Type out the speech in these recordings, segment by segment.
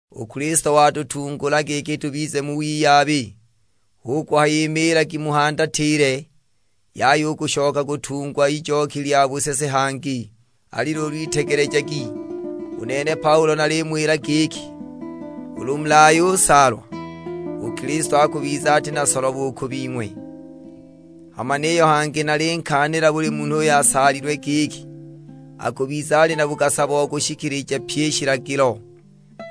U Kilisto watutungula giki tubize mu wiyabi, hu kuhaya imiilagi muhandatile, yaya u kushoka kutungwa ijoki lya busese hangi! Ali luulu itegelejagi, u nene Paulo nalimuwila giki, ulu mulayusaalwa, u Kilisto akubiza ati na solobo u ku bing'we. Hama niyo hangi nalinkaanila buli munhu uyo alasaalwe; giki, akubiza ali na bugasa bo kushishikilija pyi i shilagilo.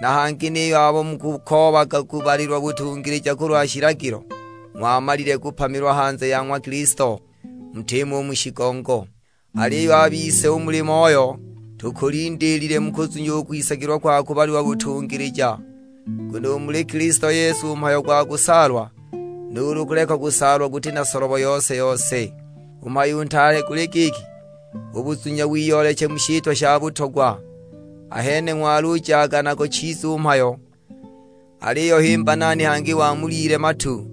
Na hangi niyo abo mukukoobaga kubalilwa butungilija kulwa shilagilo, ng'wamalile kupamilwa hanze ya ng'wa Kilisto, mutimo u mu shigongo. Aliyo a bise u muli Moyo, tukulindiilile mu kuzunya u kwisagilwa kwa kubalilwa butungilija. Nguno u muli Kilisto Yesu u mhayo gwa kusaalwa nuulu kuleka kusaalwa guti na solobo yose-yose, u mhayo u ntaale guli giki; u buzunya wiyooleche mu shitwa sha butogwa. Ahene ng'walujaga nago chiza u mhayo, aliyo himba nani hangi wamulyile matu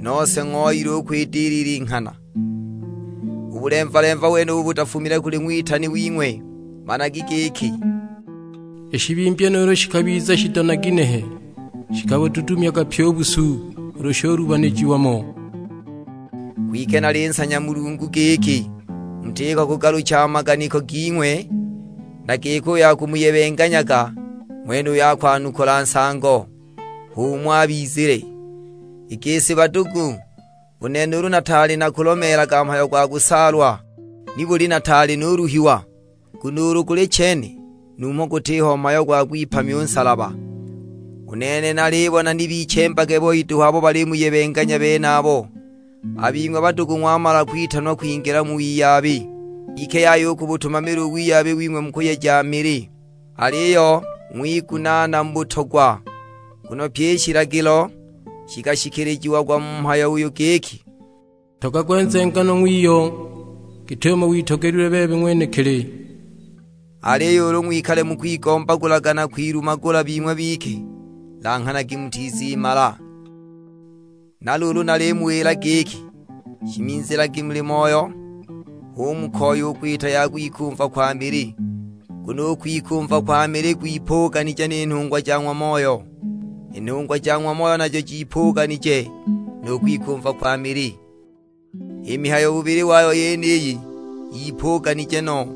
nose ng'ooyile u kwidilila i nghana! U bulemva-lemva wenubu butafumile kuli ng'witani wing'we. Managi giki i shibimbya nuulu shikabiza shido na ginehe, shikabududumyaga pyi u busu ulu shulubanijiwa mo! Kwike nalinsanya Mulungu giki mutiko kugalucha a maganiko ging'we, na giki uyo akumuyebenganyaga ng'wenuyo akugwakula nsango, h'umo abizile. I gisi badugu, u nene ulu nataali nakulomeelaga mhayo gwa kusaalwa, nibuli nataali nuluhiwa? Nguno ulu guli chene, numho gutiho mhayo gwa kugwipamya u nsalaba! U nene nalibona ni bichembage boi duhu abo balimuyebenganya benabo! A bing'we badugu ng'wamala kwitanwa kwingila mu wiyabi, kwike yaya u kubutumamila u wiyabi wing'we mu kuyeja mili, aliyo ng'wigunaana mu butogwa. Nguno pyi i shilagilo shikashikilijiagwa mu mhayo uyu giki, "Ntogagwe nzenganwa ng'wiyo git'umo witogelilwe bebe ng'wenekili." Aliyo ulu ng'wikale mukwigombagulaga na kwilumagula bing'we bike, langhanagi mutizimala! Na luulu nalimuwila giki, shimizilagi muli Moyo, hu mukoya u kwita ya kwikumva kwa mili. Nguno u kwikumva kwa mili gwipuganije ni nhungwa ja ng'wa Moyo, i nhungwa ja ng'wa Moyo najo jipuganije nu kwikumva kwa mili. I mihayo bubili wayo yeniyi yipuganije no,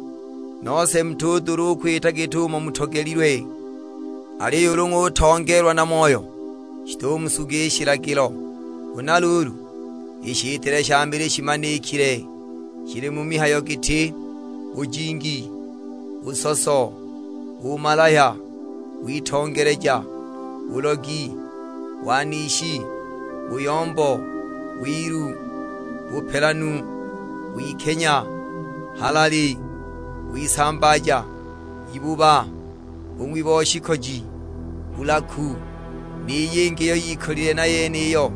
nose mutudula u kwita git'umo mutogelilwe. Aliyo ulu ng'utongeelwa na Moyo, shitumusuga i shilagilo. Huna luulu, i shitile sha mili shimanikile; shili mu mihayo giti: bujingi, busoso, bumalahya, witongeleja, bulogi, wanishi, buyombo, wilu, bupelanu, wikenya, halali, wisambaaja, ibuba, bung'wi bo shikoji, bulaku; ni yingi iyo yikolile na yeniyo.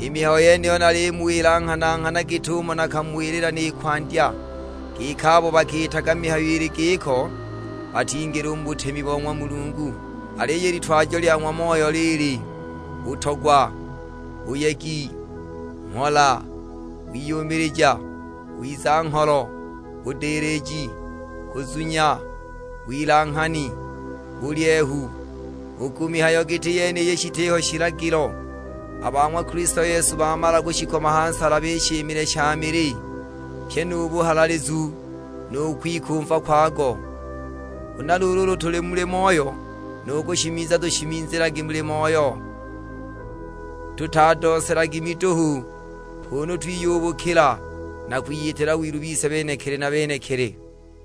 I mihayo yeniyo nalimuwila nghana-nghana git'umo nakamuwilila ni kwandya, giki abo bakiitaga mihayo ili giko, batingila u mu butemi bo ng'wa Mulungu. Aliyo i litwajo lya ng'wa Moyo lili: butogwa, buyegi, mhola, wiyumilija, wiza-ngholo, budiliji, kuzunya, wilanghani, bulyehu; u ku mihayo giti yeniyi shitiho shilagilo. A ba ng'wa Kilisto Yesu bamala kushikoma ha nsalaba i shimile sha mili, pyi nu buhahaalizu nu kwikumva kwago. Huna luulu ulu tuli muli Moyo, nu kushimiza tushimizilagi muli Moyo. Tutadooselagi miduhu, kunu twiyubukila na kwiyitila wilu bise benekili na benekili.